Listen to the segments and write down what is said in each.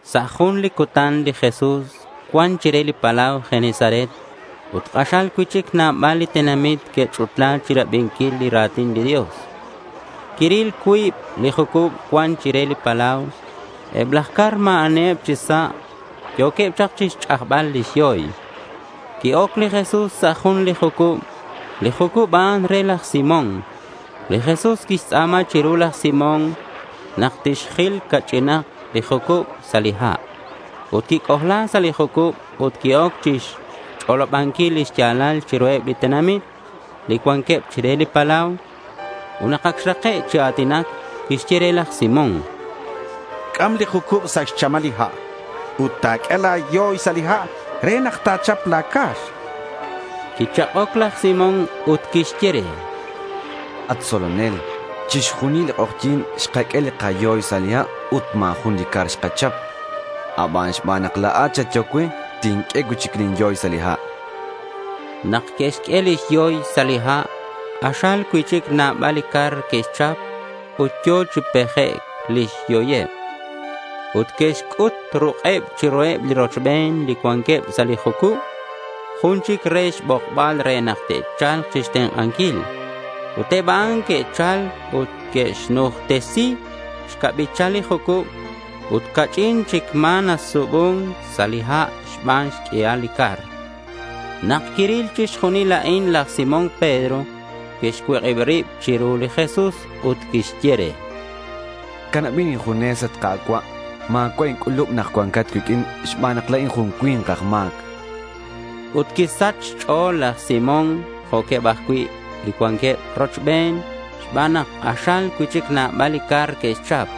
Sa' jun li cutan li Jesús cuan chire li palau Genesaret ut k'axal cui'chic nabal li tenamit que'ch'utla chirabinquil li ra̱tin li Dios. Quiril cuib li jucub cuan chire li palau. Eb laj car ma̱ aniheb chi sa'. Yo̱queb chak chixch'ajbal lix yoy. Qui-oc li Jesús sa' jun li jucub. Li jucub a'an re laj Simón. Li Jesús quixtz'a̱ma chiru laj Simón nak tixjil ca'ch'inak li jucub sa' li ha'. Ut quic'ojla sa' li jucub ut qui-oc chixch'olobanquil lix ya̱lal chiruheb li tenamit li cuanqueb chire li palau. Ut nak ac xrake' chi a̱tinac, quixye re laj Simón: —C'am li jucub sa' xchamal li ha' ut ta̱q'ue la̱ yoy sa' li ha' re nak ta̱chap la̱ car, chan li Jesús. Quichak'oc laj Simón ut quixye re: —At tzolonel, chixjunil li k'ojyi̱n xkaq'ue li kayoy sa' li ha' ut ma̱ jun li car xkachap. Abanan xban nak la̱at xatyehoc cue, tinq'ue cui'chic lin yoy sa' li ha', chan. Nak que'xq'ue lix yoy sa' li ha', k'axal cui'chic nabal li car que'xchap ut yo̱ chi pejec' lix yoyeb. Ut que'xc'ut ruk'eb chiruheb li rochben li cuanqueb sa' li jucub jun chic re xbokbaleb re nak te'cha̱lk chixtenk'anquil. Ut eb a'an que'chal ut que'xnujtesi xcabichal li jucub ut ca'ch'in chic ma̱ nasubun sa' li ha' xban xq'uial li car. Nak quiril chixjunil a'in laj Simón Pedro, quixcuik'ib rib chiru li Jesús ut quixye re: —Canabin injunes, at Ka̱cua'. Ma̱cua' inc'ulub nak cua̱nkat cuiq'uin xban nak la̱in jun cui̱nk aj ma̱c, chan. Ut quisach xch'o̱l laj Simón jo'queb ajcui' li cuanqueb rochben xban nak k'axal cui'chic nabal li car que'xchap.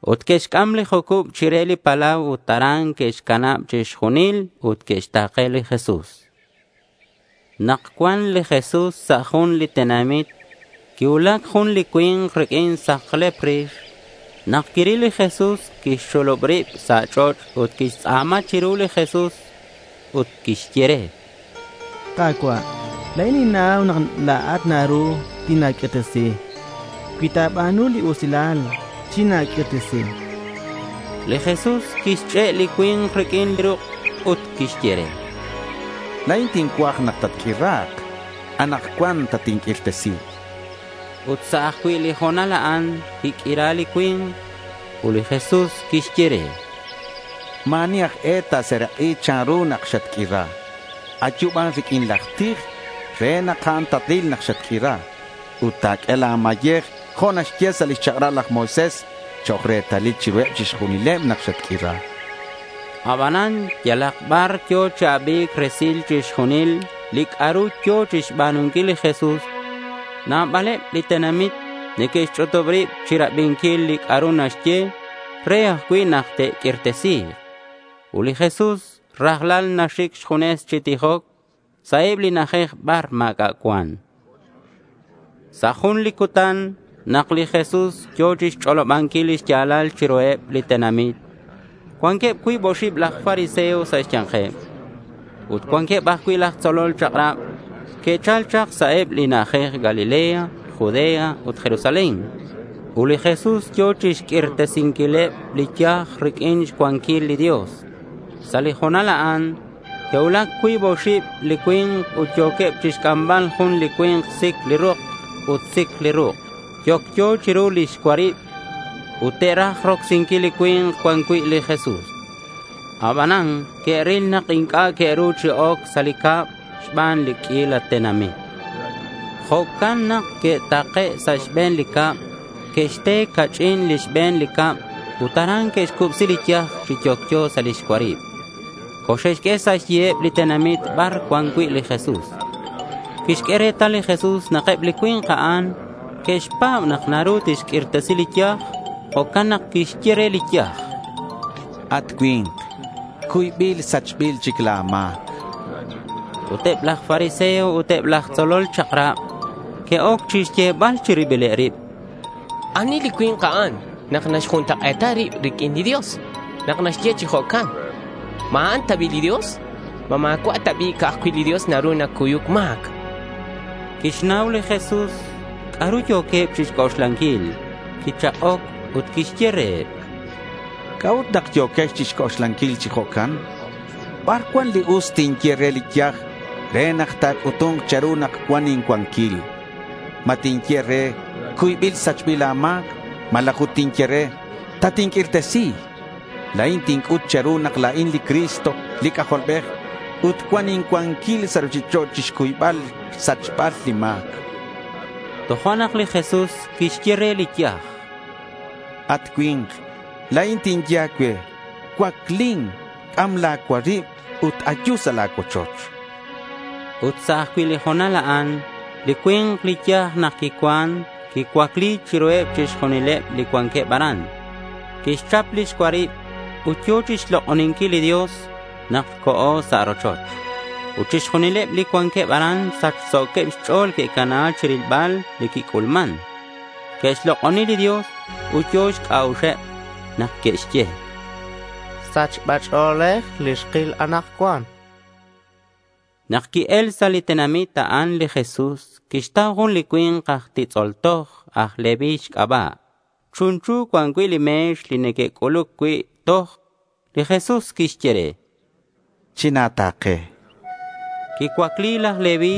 Ut que'xc'am li jucub chire li palau ut aran que'xcanab chixjunil ut que'xta̱ke li Jesús. Nak cuan li Jesús sa' jun li tenamit, quicuulac jun li cui̱nk riq'uin saklep rix. Nak quiril li Jesús quixxulub rib sa' ch'och', ut quixtz'a̱ma chiru li Jesús ut quixye re: —Ka̱cua', la̱in ninnau nak la̱at naru tina̱q'uirtesi. Cui ta̱ba̱nu li usilal, china̱q'uirtesi, chan. Li Jesús quixch'e' li cui̱nk riq'uin ruk' ut quixye re: —La̱in tincuaj nak tatq'uira̱k. Anakcuan tatinq'uirtesi, chan. Ut sa' ajcui' li ho̱nal a'an quiq'uira li cui̱nk. Ut li Jesús quixye re: —Ma̱ ani aj e ta̱serak'i chanru nak xatq'uira. Ayu ban riq'uin laj tij re nak a'an ta̱ril nak xatq'uira. Ut ta̱q'ue la̱ mayej jo' naxye sa' lix chak'rab laj Moisés chok' retalil chiruheb chixjunileb nak xatq'uira, chan li Jesús. Abanan yalak bar yo̱ chi abi̱c resil chixjunil li c'a'ru yo̱ chixba̱nunquil li Jesús. Nabaleb li tenamit neque'xch'utub ribeb chirabinquil li c'a'ru naxye ut re ajcui' nak te'q'uirtesi̱k. Ut li Jesús rajlal naxic xjunes chi tijoc sa' eb li na'ajej bar ma̱c'a' cuan. Sa' jun li cutan nak li Jesús yo̱ chixch'olobanquil lix ya̱lal chiruheb li tenamit cuanqueb cuib oxib laj fariseo sa' xya̱nkeb. Ut cuanqueb ajcui' aj tzolol chak'rab. Que'chal chak sa' eb li na'ajej Galilea, Judea ut Jerusalén. Ut li Jesús yo̱ chixq'uirtesinquileb li yaj riq'uin xcuanquil li Dios. Sa' li ho̱nal a'an que'cuulac cuib oxib li cui̱nk ut yo̱queb chixc'ambal jun li cui̱nk sic li rok ut sic li ruk' yocyo chiru lix cuarib. Ut te'raj rocsinquil li cui̱nk cuan cui' li Jesús. Abanan que'ril nak inc'a' que'ru chi oc sa' li cab xban li q'uila tenamit. Jo'can nak que'take' sa' xbe̱n li cab. Que'xte ca'ch'in li xbe̱n li cab ut aran que'xcubsi li yaj chi yocyo sa' lix cuarib. Coxe'xq'ue sa' xyiheb li tenamit bar cuan cui' li Jesús. Quixq'ue retal li Jesús nak eb li cui̱nk a'an que'xpa̱b nak naru tixq'uirtesi li yaj. Jo'can nak quixye re li yaj: —At cui̱nk, cuybil sachbil chic la̱ ma̱c, chan. Ut eb laj fariseo ut eb laj tzolol chak'rab que'oc chixyebal chi ribileb rib: —¿Ani li cui̱nk a'an nak naxjuntak'e̱ta rib riq'uin li Dios nak naxye chi jo'can? ¿Ma a'an ta bi' li Dios? ¿Ma ma̱cua' ta bi' ca'aj cui' li Dios naru nacuyuc ma̱c? chanqueb. Quixnau li Jesús c'a'ru yo̱queb chixc'oxlanquil. Quichak'oc ut quixye reheb: —¿C'a'ut nak yo̱quex chixc'oxlanquil chi jo'can? ¿Bar cuan li us tinye re li yaj re nak ta̱c'utu̱nk che̱ru nak cuan incuanquil? ¿Ma tinye re, “cuybil sachbil la̱ ma̱c” malaj ut tinye re, “tatinq'uirtesi”? La̱in tinc'ut che̱ru nak la̱in li Cristo li C'ajolbej ut cuan incuanquil sa' ruchich'och' chixcuybal xsachbal li ma̱c, chan reheb. Tojo'nak li Jesús quixye re li yaj, —At cui̱nk, la̱in tinye a̱cue, cuaclin, c'am la̱ cuarib ut ayu sa' la̱ cuochoch, chan. Ut sa' ajcui' li ho̱nal a'an li cui̱nk li yaj nak quicuan quicuacli chiruheb chixjunileb li cuanqueb aran. Quixchap lix cuarib ut yo̱ chixlok'oninquil li Dios nak co̱ sa' rochoch. Ut chixjunileb li cuanqueb aran sachso̱queb xch'o̱l que'cana chirilbal li quic'ulman. Que'xlok'oni li Dios ut yo̱ xc'a'uxeb nak que'xye: —Sachba ch'o̱lej li xkil anakcuan, chanqueb. Nak qui-el sa' li tenamit a'an, li Jesús quixtau jun li cui̱nk aj titz'ol toj aj Leví xc'aba'. Chunchu cuan cui' li me̱x li neque'c'uluc cui' toj. Li Jesús quixye re: —China̱ta̱ke, chan. Quicuacli laj Leví.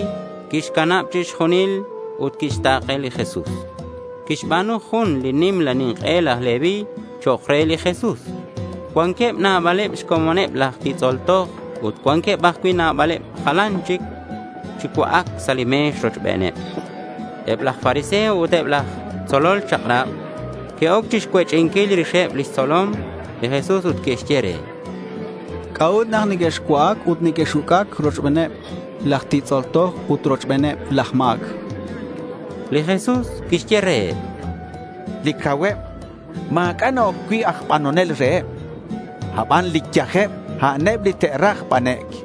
Quixcanab chixjunil ut quixta̱ke li Jesús. Quixba̱nu jun li nimla nink'e laj Leví chok' re li Jesús. Cuanqueb nabaleb xcomoneb laj titz'ol toj ut cuanqueb ajcui' nabaleb jalan chic chi cua'ac sa' li me̱x rochbeneb. Eb laj fariseo ut eb laj tzolol chak'rab que'oc chixcuech'inquil rixeb lix tzolom li Jesús ut que'xye reheb: —¿C'a'ut nak nequexcua'ac ut nequex-uc'ac rochbeneb laj titz'ol toj ut rochbeneb laj ma̱c? chanqueb. Li Jesús quixye reheb: —Li cauheb ma̱c'a' na-oc cui' aj banonel reheb. Aban li yajeb, a'aneb li te'raj banec'.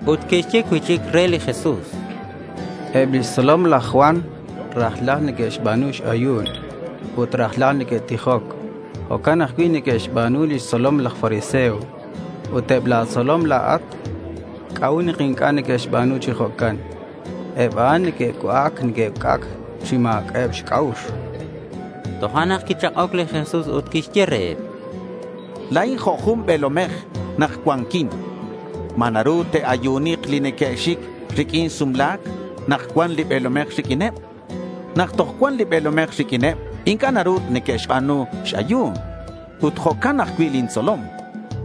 Ut que'xye cui'chic re li Jesús: —Eb lix tzolom laj Juan rajlal neque'xba̱nu x-ayu̱n ut rajlal neque'tijoc. Jo'can ajcui' neque'xba̱nu lix tzolomeb laj fariseo. Ut eb la̱ tzolom la̱at, ¿c'a'ut nak inc'a' neque'xba̱nu chi jo'can? Eb a'an neque'cua'ac neque'uc'ac chi ma̱c'a'eb xc'a'ux, chanqueb. Tojo'nak quichak'oc li Jesús ut quixye reheb: —La̱in jo' jun be̱lomej nak cuanquin. ¿Ma naru te'ayunik li neque'xic riq'uin sumla̱c nak cuan li be̱lomej riq'uineb? Nak toj cuan li be̱lomej riq'uineb inc'a' naru neque'xba̱nu x-ayu̱n. Ut jo'can ajcui' lin tzolom.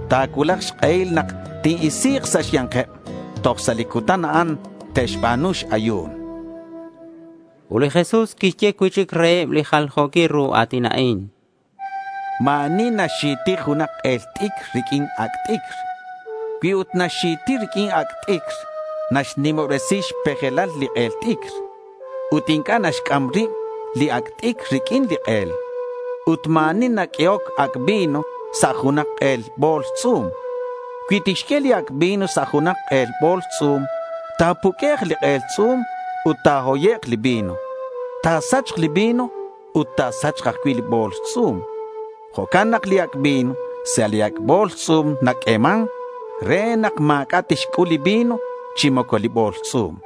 Ta̱cuulak xk'ehil nak tin-isi̱k sa' xya̱nkeb. Toj sa' li cutan a'an te'xba̱nu x-ayu̱n, chan reheb. Ut li Jesús quixye cui'chic reheb li jaljo̱quil ru a̱tin a'in: Ma̱ ani naxxi̱ti junak k'el t'icr riq'uin ac' t'icr. Cui ut naxxi̱ti riq'uin ac' t'icr, naxnimobresi xpejelal li k'el t'icr. Ut inc'a' naxc'am rib li ac' t'icr riq'uin li k'el. Ut ma̱ ani naq'uehoc ac' vino sa' junak k'el bo̱ls tz'u̱m. Cui tixq'ue li ac' vino sa' junak k'el bo̱ls tz'u̱m, ta̱puq'uek' li k'el tz'u̱m ut ta̱hoyek' li vino. Ta̱sachk li vino ut ta̱sachk ajcui' li bo̱ls tz'u̱m. Jo'can nak li ac' vino sa' li ac' bo̱ls tz'u̱m naq'ueman re nak ma̱c'a' tixc'ul li vino chi moco li bo̱ls tz'u̱m.